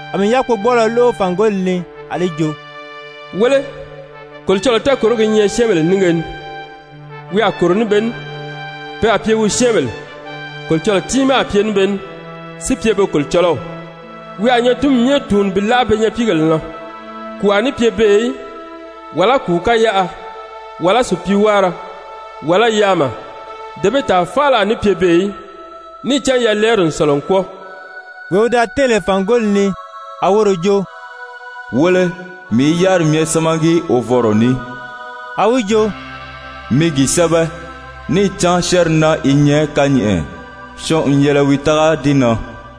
A mii yákpogbɔɔlɔ lóʔo fàngoli ni a li jo: «Wéle, Kolocɔlɔɔ tɛɛkòrogi i nyɛ syɛ́ɛnbèle nínge ni! Wi a kòro ní be ní, pe a pye wi syɛ́ɛnbèle, Kolocɔlɔɔ tiimaa a pye ní be ní, si pye be Kolocɔlɔw. Wi a nyatinmi myɛ tùuni bi láʔa pe nyapiigèle na, kùu a ní pye beè í, wàlá kùu káyaʔa, wàlá sùpiiwáara, wàlá yaama, dee bee tàa faala a ní pye beè í, níì cán yalɛɛri n sɔ̀lɔ n kwɔ́ɔ.» Wee wi da tɛ́ɛn lè fàngoli ni, a woro jo: «Wéle, mii i yáriri myɛ sámagi wovɔnrɔ ní.» A wi jo: «Mi gi sɛ́bɛ, níì cán syɛ́ɛnri naa i nyɛ kányɛʔɛ, syɔɔn n yɛlɛ wi tága di na.»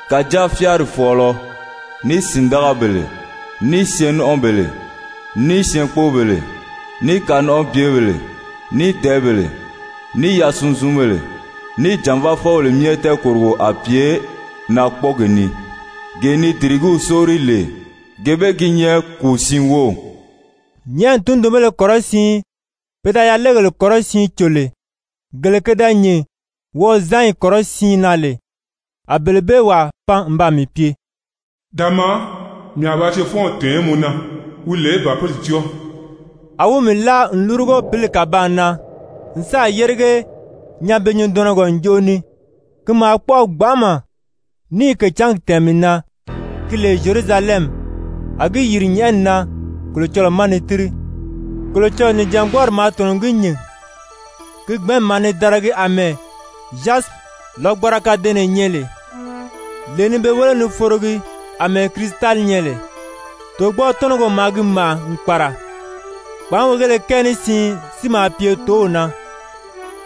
Kàjáa fyáari fɔ̀ɔlɔ, ní sìndagabèle, ní syɛɛn-nɔ́nʔɔbèle, ní syɛɛnkpoobèle, ní kanɔnʔɔbyebèle, ní dɛ̀ɛ́bèle, ní yasunzunbèle, ní jànvaafɔbèle myɛ tɛɛkòrogo a pye naakpɔɔgi ni, gee ni dìrigíw sóori lè, gee bee gi nyɛ kùu siin wów.» Nyɛ̀ʔɛni tundunbéle kɔrɔsiin pe da yalegèle kɔrɔsiin cò lè, gele ke da nyìn wɔʔɔzanyi kɔrɔsiin na lè, a bele bee wàa pan n baa mii pye: «Da maa, mii a ba cefɔnw tɛ̀ɛn mɔ na, wi lè Bàpili cɔ́ɔ.» A wi mii láa n lúrugo pǐli kàbaan na n sáà yérige nyanbe-nyundɔnɔgɔ njoʔo ni, ki maa kpɔ́ʔɔ gbanʔama, níì kècǎngi tɛ̀ɛn mii na, ki lè Zyerusalɛmi, a gi yìri nyɛ̀ʔɛni na Kolocɔlɔɔ ma ni tíri. Kolocɔlɔɔ nìjangbɔɔri maa tɔ̀nɔ n gi nyìn, ki gbɛ̀ɛ́nmi maa ni daragi àmɛɛ zyasipi lɔgbanra kadɛɛnnɛ nyɛ lè, lee ni be wéle ni forogi àmɛɛ kirisitali nyɛ lè. Tògbɔɔ-tɔ́nɔgɔ maa gi màʔa n kpàra. Kpàánweegéle kɛɛ ní siin si maa pye tǒw na,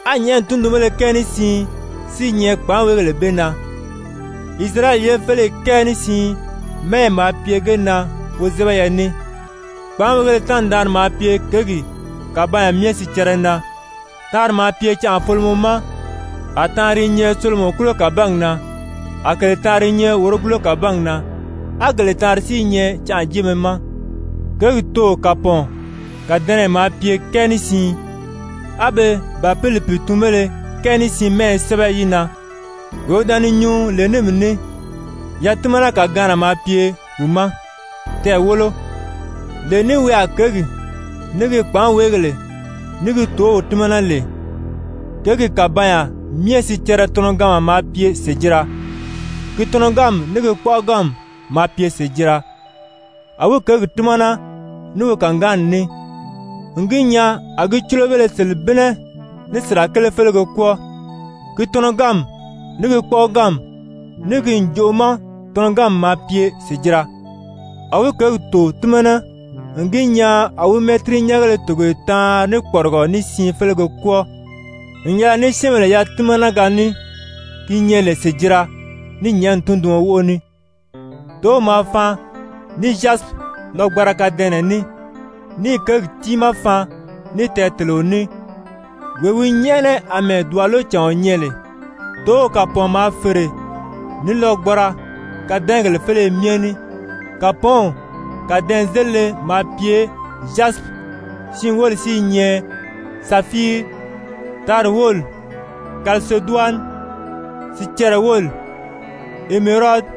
á nyɛ̀ʔɛni tundunbéle kɛɛ ní siin si i nyɛ kpàánweegèle bee na. Isirayɛli ye féleyi kɛɛ ní siin mɛ́ɛyɛ maa pye ge na wozɛbɛyɛ ní. Kpàánweegéle taanri-daanri maa pye kěgi kàbanya myɛ sicɛrɛ na, taanri maa pye canʔafolomɔ ma, a taanri i nyɛ solomɔkulo kàbangi na, a kèle taanri i nyɛ wòrogulo kàbangi na, á gele taanri si i nyɛ canʔajeemɛ ma. Kěgi tò kàpɔɔn kàdɛnɛyɛ maa pye kɛɛ ní siin, á be Bàpili pìitunbéle kɛɛ ní siin mɛ́ɛyɛ sɛ́bɛ yi na. Wee wi da ni nyuu lè ní mii ní, yatimana-kàgaanna maa pye wi ma, tɛɛ̀ wólo, lee ní wi a kěgi, ní gi kpàánweegèle, ní gi tǒw tímana lè. Kěgi kàbanya myɛ sicɛrɛ tɔnɔganma maa pye sèjira, ki tɔnɔganmi ní gi kpɔ́ʔɔganmi maa pye sèjira. A wi kěgi tímana ní wi kàgaanni ní n gi nyaa a gi cúlobéle selebinnɛ ní sirakele félege kwɔ́ɔ. Ki tɔnɔganmi, ní gi kpɔ́ʔɔganmi, ní gi ǹjoʔo ma tɔnɔganmi maa pye sèjira. A wi kěgi tò tímana n gi nyaa a wi mɛ́tirinyɛngéle togoye taanri ní kpɔrigɔ ní siin félege kwɔ́ɔ n yɛlɛ ní syɛ́ɛnbèle yatimanaga ní ki nyɛ lè sèjira ní nyɛ̀ʔɛni tunduɔn wóʔo ní. Tǒw maa faan ní zyasipi lɔgbanra kàdɛɛnnɛ ní, níì kěgi tiimaa faan ní tɛɛteleo ní, wee wi nyɛ́ʔɛnɛ àmɛɛ dùbalecàɔn nyɛ lè. Tǒw kàpɔɔn maa fère ní lɔgbanra kadɛɛngèle féleye myɛ ní, kàpɔɔnw kàdɛɛnzelile maa pye zyasipi, siin wóli si i nyɛ safiiri, taanri wóli kaliseduwani, sicɛrɛ wóli emerodi,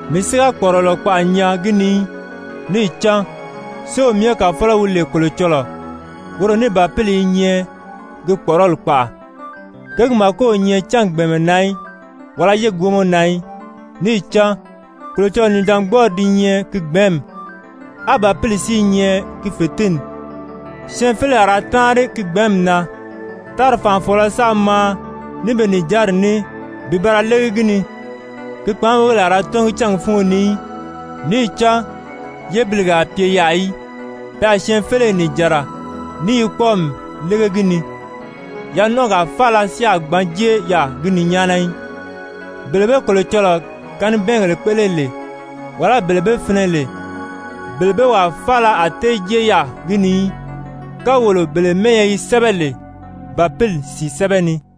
Mii si ga kpɔ̀ʔɔrɔlɔ kpaʔa nyaa gi ni í, níì cán Séew Myɛ Kàfɔlɔ wi lè Kolocɔlɔɔ, woro ní Bàpili i nyɛ gi kpɔ̀ʔɔrɔli kpaʔa. Kěgi màko o nyɛ cángi gbɛ̀ɛnmɛ na í, wàlá yégi wómɔ na í, níì cán Kolocɔlɔɔ nìjangbɔɔri di nyɛ ki gbɛ̀ɛ́nmi, á Bàpili si i nyɛ gi fètinni. Syɛɛnfeleyi a ra táanri ki gbɛ̀ɛ́nmi na, tári fànʔafɔɔlɔ sáā maa ní be nìjanri ní bi ba ra légi gi ni. Ki kpàánweegèle a ra tɔ́ngi cángi fúngo ni í, níì cán yébilige a pye yaà í. Pe a syɛɛnfeleyi nìjanra ní yi kpɔ́ɔmi lége gi ni. Yanɔnʔɔgaa faala si a gbǎn jée yaà gi ni nyáana í, bele be Kolocɔlɔɔ kanibɛɛngèle kpéʔele lè, wàlá bele be finɛ lè, bele bee wàa faala a tée jée yaà gi ni í, kawolo bele mɛ́ɛyɛ yi sɛ́bɛ lè Bàpili sìi sɛ́bɛ ni.